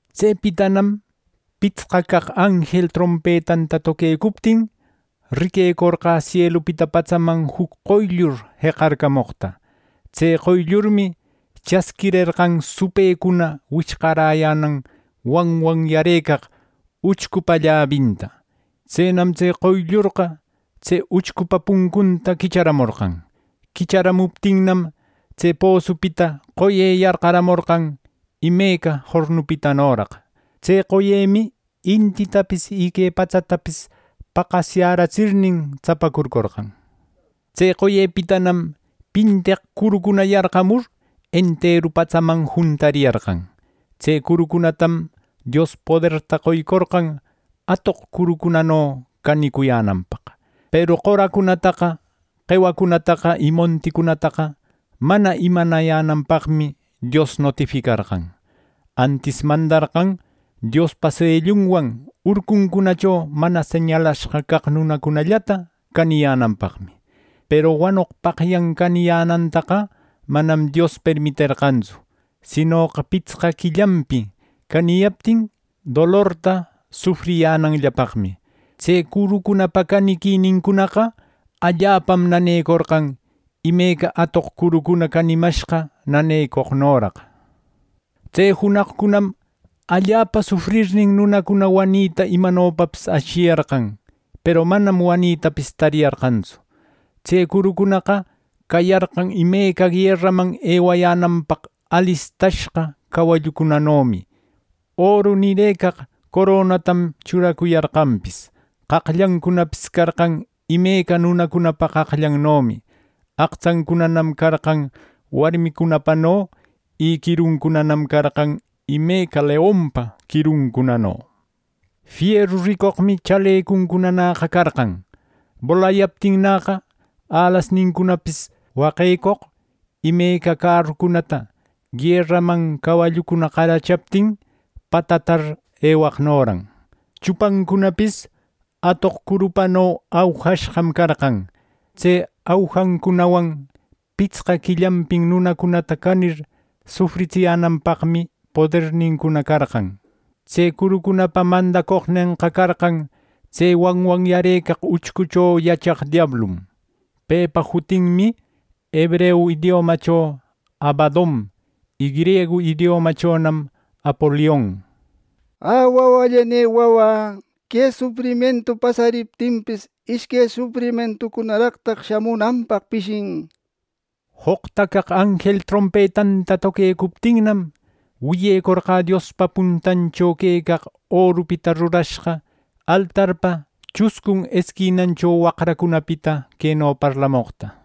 Tsepitanam pitsqa caq anjel trompetanta toquecuptin, riquecorqä sielupita patsaman juc qoyllur jeqacarcamoqta. Tse qoyllurmi chasquirerqan supëcuna wichqaräyänan wanwanyarëcaq uchcupa llabinta. Tsenam tse qoyllurqa tse uchcupa puncunta quicharamorqan. Quicharamuptinnam, tse posupita qoye yarqaramorqan imeca jornupitanoraq. Tse qoyemi intitapis y que patsatapis paqasyätsirnin tsapacurcorqan. Y tse qoyepitanam pinteq curucuna yarqamur enteru patsaman juntariyarqan. Tse curucunatam Dios poderta qoycorqan atoq curucunano canicuyänanpaq. Peru qoracunataqa, qewacunataqa y monticunataqa mana imanayänanpaqmi Dios notificarqan. Antis mandarqan Diospa sellunwan urcuncunacho mana señalashqa caq nunacunallata caniyänanpaqmi. Peru wanoqpaqyan caniyänantaqa manam Dios permiterqantsu, sinoqa pitsqa quillanpi caniyaptin dolorta sufriyänanllapaqmi. Tse curucunapa caniquinincunaqa allapam nanecorqan, imeca atoq curucuna canimashqa nanecoqnoraq. Tse junaqcunam allapa sufrirnin, nunacuna wanita imanopapis ashiyarqan, peru manam wanitapis tariyarqantsu. Tse curucunaqa cayarqan imeca gueraman ewayänanpaq alistashqa cawallucunanomi, oru nirëcaq coronatam churacuyarqanpis. Qaqllancunapis carqan imeca nunacunapa qaqllannomi. Aqtsancunanam carqan warmicunapano, y quiruncunanam carqan imeca leonpa quiruncunano. Fieru ricoqmi chalecuncunanäqa carqan. Bolayaptinnäqa, alasnincunapis waqecoq imeca cärucunata gueraman cawallucuna qarachaptin patatar ewaqnoran. Chupancunapis atoq curupano aujashqam carqan. Tse aujancunawan pitsqa quillanpin nunacunata canir sufritsiyänanpaqmi podernincuna carqan. Tse curucunapa mandacoqnenqa carqan tse wanwanyarëcaq uchcucho yachaq diablum. Pepa jutinmi hebreu idiomacho “Abadon” y griegu idiomachonam “Apolion”. ¡Ä wawallanï wawä! Que sufrimientu pasariptinpis, ishque sufrimientucunaraq shamunanpaq pishin. Joqta caq anjel trompetanta toquecuptinnam, wiyecorqä Diospa puntancho quecaq orupita rurashqa altarpa chuscun esquinancho waqracunapita queno parlamoqta: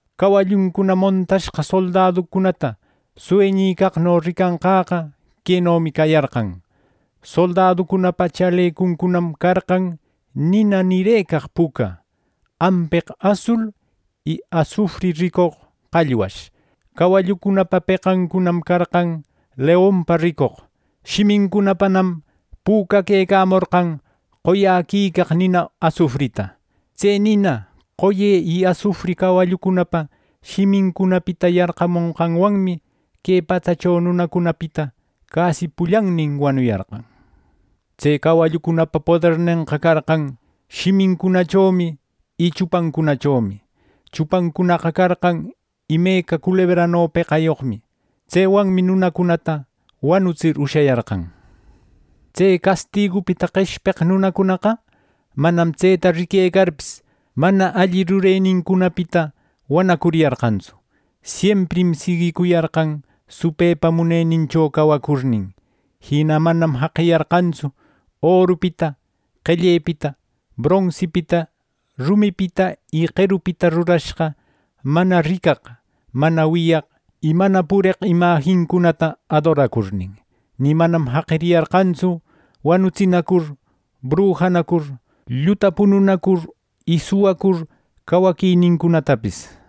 Cawalluncuna montashqa soldaducunata sueñicaqno ricanqäqa quenomi cayarqan. Soldaducunapa chalecuncunam carqan nina nirëcaq puca, ampeq asul y asufri ricoq qallwash. Cawallucunapa peqancunanam carqan leonpa ricoq. Shimincunapanam pücaquecamorqan qoyäquicaq nina asufrita. Tse nina, qoye y asufri cawallucunapa shimincunapita yarqamoqwanmi, que patsacho nunacunapita casi pullannin wanuyarqan. Tse cawallucunapa podernenqa carqan shimincunachomi y chupancunachomi. Chupancunaqa carqan imeca culebrano peqayoqmi. Tsewanmi nunacunata wanutsir ushayarqan. Tse castigupita qeshpeq nunacunaqa manam tseta riquecarpis, mana alli rurenincunapita wanacuriyarqantsu. Siemprim siguicuyarqan, supëpa munenincho cawacurnin. Jina manam jaqiyarqantsu orupita, qellepita, bronsipita, rumipita y qerupita rurashqa mana ricaq, mana wiyaq y mana pureq imajincunata adoracurnin. Ni manam jaqiyarqantsu wanutsinacur, brujanacur, lluta pununacur y suwacur cawaquinincunatapis.